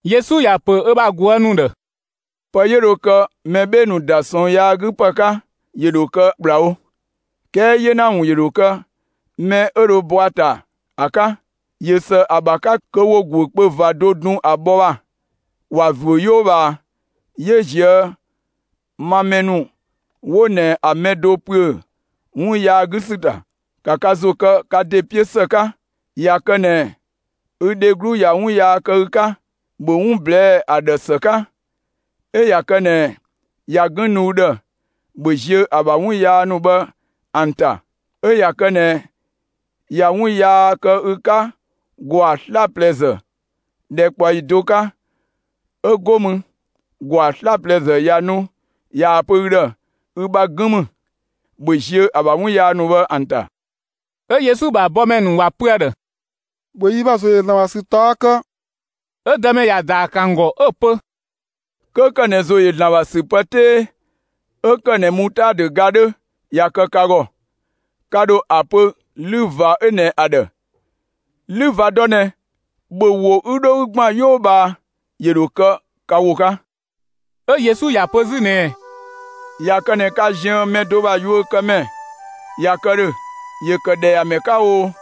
Yesu ‑ya ‑pö ö bha ꞊guë' ‑nu ‑dhë: «Pë 'yö dho kë mɛ 'bhee‑ ‑nu ‑da ꞊sɔɔn yaa 'gü ‑pë 'ka, ‑yö ‑dho kë ‑kplawo, 'kɛɛ 'yena ‑wun ‑yö ‑dho kë mɛ 'ö dho bɔ ‑a ‑ta ‑a 'ka! ꞊Yö ‑së ‑a ‑bha 'ka kö ‑wo ‑guökpö ꞊va do dun ‑a bhɔ ‑bha, ‑wa ‑zuö 'yoo ꞊bhaa 'yö ꞊zië' ma mɛ ‑nu 'wo ꞊nɛ ‑a mɛ do ‑püö 'wun yaa 'gü ‑sü ‑ta. ‑Ka ka ‑zo kë ka ‑de 'piö ‑së 'ka! ꞊Ya kë ꞊nɛ ü dheglu ꞊ya 'wun yaa kë ü 'ka, ‑bhö 'wun ꞊blɛɛ'‑ ‑a ‑dhë ‑së 'ka. 'Ö ꞊ya kë ꞊nɛ ꞊ya 'gën nu ü ‑dhë, ‑bhö ziö ‑a ‑bha 'wun yaa ‑nu bhë ‑an ‑ta. 'Ö ꞊ya kë ꞊nɛ ꞊ya 'wun yaa kë ü 'ka ‑gwaa 'slaplɛzë ‑dhɛkpaɔyi do 'ka, 'ö go mü ‑gwaa 'slaplɛzë ꞊ya nu ꞊yaa‑ pö ü ‑dhë: ‹Ü bha 'gën ‑mü›, ‑bhö ziö ‑a ‑bha 'wun yaa ‑nu bhë ‑an ‑ta!» 'Ö Yesu ‑bha bɔmɛ ‑nu ‑wa pö ‑a ‑dhë: «‑Bhö yi ‑bha ‑zo ‑yö ‑Zlan ‑bha ‑sü ꞊taɔ' kë!» 'Ö Dëmɛ ‑ya ‑daa ‑kë ‑an ‑gɔ 'ö‑ pö: «'Kö kë ꞊nɛ ‑zo ‑yö ‑Zlan ‑bha ‑sü pë 'tee 'ö ‑kë ꞊nɛ mutaadö ga 'dhö ꞊ya kë ka ‑gɔ, ka ‑dho ‑a pö 'lü ꞊va 'ö ꞊nɛ ‑a ‑dhë: ‹'Lü ꞊va dɔ ꞊nɛ, ‑bhö wo 'ü 'dho 'ü ‑gban 'yoo ꞊bhaa!›, ‑yö ‑dho kë ka ‑wo 'ka.» 'Ö Yesu ‑ya pö 'zü ꞊nɛɛ: «꞊Ya kë ꞊nɛ ka ziën mɛ do ‑bha yuökëmɛ ꞊ya kë ‑dhö, ‑yö ‑kë ‑dhɛyamɛ 'ka o,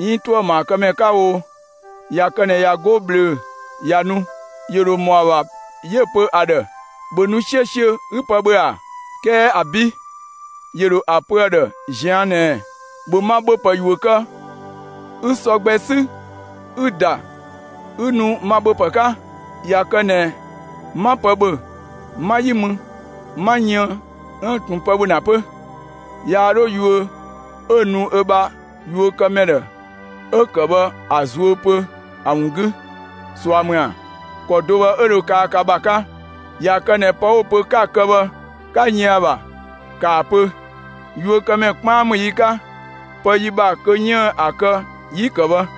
'iin ‑tuëmaakëmɛ 'ka o, ꞊ya kë ꞊nɛ ꞊ya 'go ꞊bhlöö‑ ꞊ya nu, ‑yö ‑dho ‑mɔ ‑a ‑bha 'yö‑ pö ‑a ‑dhë: ‹‑Bhö nu 'siösiö 'ü pë ‑bhö› ‑a? 'Kɛɛ ‑abi', ‑yö ‑dho ‑a pö ‑a ‑dhë ꞊zian' ꞊nɛɛ: ‹‑Bhö ma ‑bhöpë ‑yuö kë 'ü sɔ gbɛ 'sü 'ü‑ ‑da 'ü nu ma ‑bhöpë 'ka! ꞊Ya kë ꞊nɛ 'ma pë ‑bhö, 'ma 'yi mü 'ma yën 'üën‑ ꞊tun pë ‑bhö ‑na 'pö!› Yaa 'dho yuö 'ö‑ nu ö bha yuökëmɛ ‑dhë 'ö‑ kë bhë ‑a zuö pö ‑a ‑wun 'gü, ꞊sua ‑mü ‑a? ‑Kɔ do bhë 'ö dho kaa ka ‑bha 'ka. ꞊Ya kë ꞊nɛ pë 'wo‑ pö 'ka‑ kë bhë, 'ka yën ‑a ‑bha, ‑kaa pö: ‹Yuökëmɛ 'kpaan ‑mü yi 'ka, pë yi ‑bha kö 'yiën‑ ‑a kë 'yi‑ ‑kë bhë.›»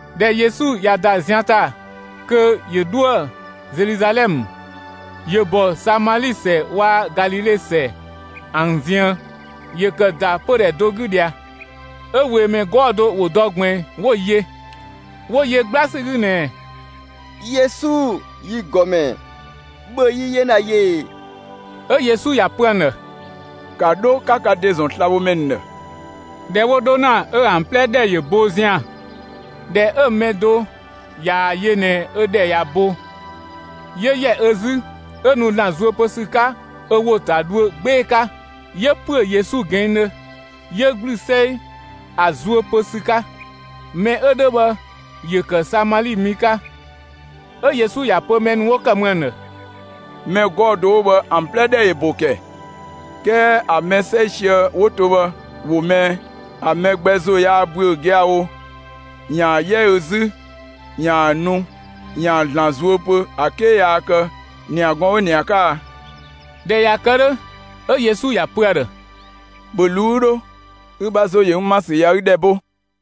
꞊Dhɛ Yesu ꞊ya ‑da zian ‑ta kö ‑yö 'dhoë‑ Zeluzalɛmë, ‑yö ‑bɔ Samali ‑sɛ waa‑ Galile ‑sɛ ‑an ziën. ‑Yö ‑kë ‑da pödhɛ do 'gü ꞊dhia, 'ö ꞊weemɛ 'gɔɔ‑ do ‑wo dɔ ꞊gbiin 'wo‑ yö, 'wo yö 'gbla ‑sü 'gü ꞊nɛɛ: «Yesu, yi ‑Gɔmɛ, ‑bhö yi 'yena yö ꞊ee!» 'Ö Yesu ‑ya pö ‑an ‑dhë: «‑Ka 'dho 'ka ka ‑de ‑zɔn slabhomɛ ‑nu ‑dhë!» ꞊Dhɛ 'wo 'dho ‑na, 'ö ‑an 'plɛ ‑dhɛ ‑yö bo zian‑. ꞊Dhɛ 'ö‑ mɛ do ꞊yaa‑ yö ꞊nɛ ö ‑dhɛ ꞊ya bo, 'yö ‑yɛ ö 'zü 'ö nu ‑Zlan zuö pö ‑sü 'ka ö ‑wo ‑ta dhuö 'gbee‑ 'ka, 'yö‑ ‑püö Yesu ꞊gɛɛndhö 'yö ‑gblü 'sɛi ‑a zuö pö ‑sü 'ka. Mɛ 'ö 'dhö bhë ‑yö ‑kë Samali mi 'ka. 'Ö Yesu ‑ya pö mɛ ‑nu 'wo ‑kë mü ‑an ‑dhë: «Mɛ 'gɔɔ‑ do 'wo bhë ‑an 'plɛ ‑dhɛ ‑yö ‑bo ‑kɛ, 'kɛɛ ‑a mɛ 'sɛisië 'wo to bhë, ‑wo më ꞊ɛ? ‑A mɛ gbɛ ‑zo yaa ‑büö giawo ‑yaan 'yɛ ö 'zü yaa nu ‑yaan ‑Zlan zuö pö ‑a 'ke yaa kë ‑niagɔɔn 'ö ꞊nɛ ‑a 'ka a?» ꞊Dhɛ ꞊ya kë 'dhö, 'ö Yesu ‑ya pö ‑a ‑dhë: «‑Bhö ꞊luu'‑ 'ü 'dho, ü ‑bha ‑zo ‑yö n ‑ma ‑sü ꞊ya ü ‑dhɛ bo!»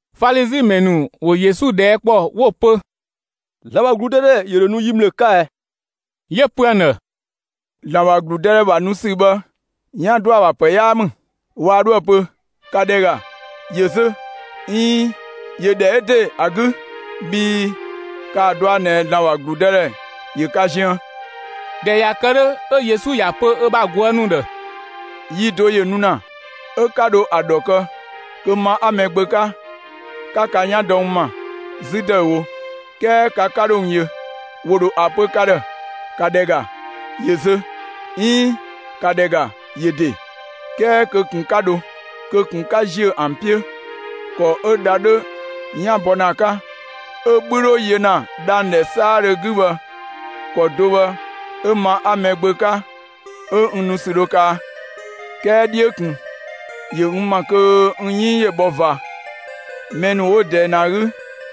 Falizi ‑mɛ ‑nu ‑wo Yesu ꞊dhɛɛ' ‑kpɔ 'wo‑ pö: «‑Zlan ‑bha ‑gludëdhɛ ‑yö ‑dho nu yi ‑mlë 'ka ɛ?» 'Yö‑ pö ‑an ‑dhë: «‑Zlan ‑bha ‑gludëdhɛ ‑bha nu ‑sü bhë 'yan ‑dɔ ‑a ‑bha ‑pë 'yaa ‑mü. Waa 'dhoë‑ pö: ‹‑Ka ‑dhɛ ‑ga, ‑yö zö!› 'iin ‹‑yö ‑dhɛ 'ö ‑de ‑a 'gü!›, bhii ‑kaa ꞊dɔa' ꞊nɛ ‑Zlan ‑bha ‑gludëdhɛ ‑yö ka ziën.» ꞊Dhɛ ꞊ya kë 'dhö, 'ö Yesu ‑ya pö ö bha ꞊guë' ‑nu ‑dhë: «Yi do ‑yö nu ‑na 'ö 'ka dho ‑a ‑dhɔ kë kö ma 'a Mɛgbö 'ka, 'ka ka 'yan dɔ n ‑ma 'zü ‑dëüwo, 'kɛɛ ka 'ka 'dho n yö. ‑Wo ‑dho ‑a pö ka ‑dhë: ‹‑Ka ‑dhɛ ‑ga, ‑yö zö!› 'iin: ‹‑ka ‑dhɛ ‑ga, ‑yö ‑de!›, 'kɛɛ kö ꞊kun 'ka 'dho, kö ꞊kun 'ka ziö ‑an 'piö! ‑Kɔ 'ö dha 'dhö 'yan bhɔ ‑na ‑a 'ka, 'ö‑ 'bhü 'dho yö ‑na dhang‑ ‑dhɛ 'saadhö 'gü bhë, ‑kɔ do bhë 'ö ma 'a Mɛgbö 'ka 'ö n nu ‑sü dho kaa. 'Kɛɛ 'dhiö ꞊kun ‑yö n ‑ma kö n 'yënng ‑yö bhɔ ꞊va; mɛ ‑nu 'wo ꞊dɛɛ ꞊nɛ ‑a 'gü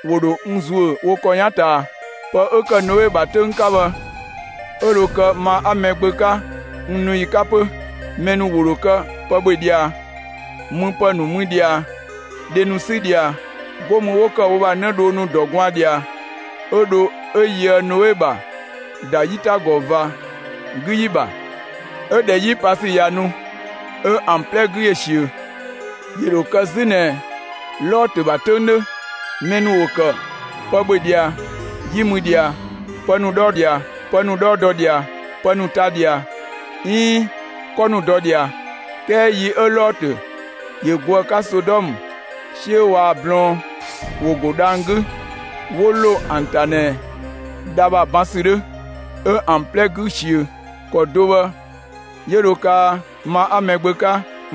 ‑wo ‑dho n ‑zuö wo ‑kɔ 'yan ꞊taa. Pë 'ö ‑kë Noe ‑bha 'töng 'ka bhë, 'ö dho kë ma 'a Mɛgbö 'ka n nu ‑yi 'ka 'pö. Mɛ ‑nu ‑wo ‑kë pë ‑bhö ꞊dhia, müpë ‑nu mü ꞊dhia, dhe ‑nu 'sü ꞊dhia, 'go mü 'wo ‑kë wo ‑bha 'nëdhoo ‑nu ‑dɔ gwaan ꞊dhia, 'ö dho 'ö yöë Noe ‑bha ‑da 'yitagɔ ꞊va 'gü ‑yi ‑bha; 'ö ꞊dhɛ 'yi pa ‑sü ꞊ya nu, 'ö ‑an 'plɛ 'gü ‑yö ꞊siö. ‑Yö ‑dho kë 'zü ꞊nɛ Lɔtö ‑bha 'töng 'dhö: Mɛ ‑nu ‑wo ‑kë pë ‑bhö ꞊dhia, 'yi mü ꞊dhia, pë ‑nu 'dhɔ ꞊dhia, pë ‑nu 'dhɔɔ dɔ ꞊dhia, pë ‑nu ta ꞊dhia, 'iin 'kɔ ‑nu dɔ ꞊dhia. 'Kɛɛ yi 'ö Lɔtö ‑yö go ‑a 'ka Sodɔmë, 'siö waa‑ blɔɔn ‑wo ‑go dhang‑ 'gü 'wo ‑lo ‑an ‑ta ꞊nɛ dha ‑bha ban ‑sü 'dhö, 'ö ‑an 'plɛ 'gü‑ ꞊siö. ‑Kɔ do bhë 'yö dho kaa ma 'a Mɛgbö 'ka,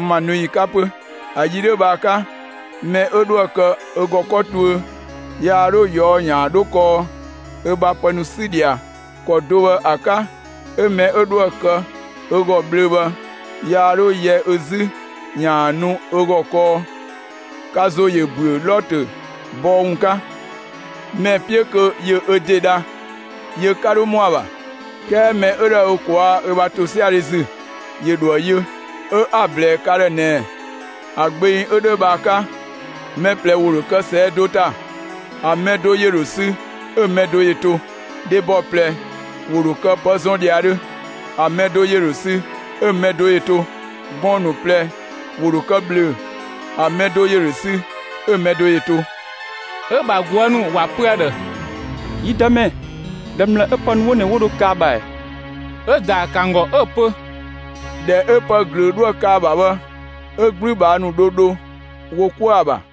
ma nu ‑yi 'ka 'pö. ‑A yi 'dhö bhë ‑a 'ka, mɛ 'ö 'dhoë‑ kë ö ‑gɔ 'kɔ tuö, yaa 'dho ꞊yɔɔ'‑ ‑yaan 'dho kɔɔ ö bha pë ‑nu 'sü ꞊dhia. ‑Kɔ do bhë ‑a 'ka 'ö mɛ 'ö 'dhoë‑ kë ö ‑gɔ ꞊bhlöö‑ bhë, yaa 'dho yɛ ö 'zü ‑yaan nu ö ‑gɔ kɔɔ. Ka ‑zo ‑yö ‑büö Lɔtö bɔɔ ‑wun 'ka! Mɛ‑ 'piö kö ‑yö ö ‑de dha, yö 'ka 'dho ‑mɔ ‑a ‑bha; 'kɛɛ mɛ 'ö dhoë ö ꞊kwaa' ö ‑bha ‑tosiadhe ‑zü, ‑yö ‑dho ‑a yö. 'Ö 'a‑ ꞊blɛɛ ka ‑dhë ꞊nɛɛ: ‑A gbeng 'ö 'dhö bhë ‑a 'ka, mɛ ꞊plɛ ‑wo ‑dho kë ꞊sɛɛ' do ‑ta, ‑a mɛ do ‑yö ‑dho sü 'ö‑ mɛ do ‑yö to. Dhebɔ ꞊plɛ ‑wo ‑dho kë pë zɔn ‑dhiadhö, ‑a mɛ do ‑yö ‑dho sü 'ö‑ mɛ do ‑yö to. [Gɔɔn‑ ‑nu ꞊plɛ ‑wo ‑dho kë ꞊bhlöö‑, ‑a mɛ do ‑yö ‑dho sü, 'ö‑ mɛ do ‑yö to.]» 'Ö‑ ‑bha ꞊guë' ‑nu ‑wa pö ‑a ‑dhë: «Yi Dëmɛ, ‑dhɛ ‑mlë 'ö pë ‑nu 'wo ꞊nɛ 'wo dho kë ‑a ‑bha ‑ɛ?» 'Ö‑ ‑daa ‑kë ‑an ‑gɔ 'ö ‑pö: «‑Dhɛ 'ö pë ꞊glöö 'dhoë‑ kë ‑a ‑bha bhë, 'ö 'gblübhaa ‑nu dho dho wo 'kuë‑ ‑a ‑bha.»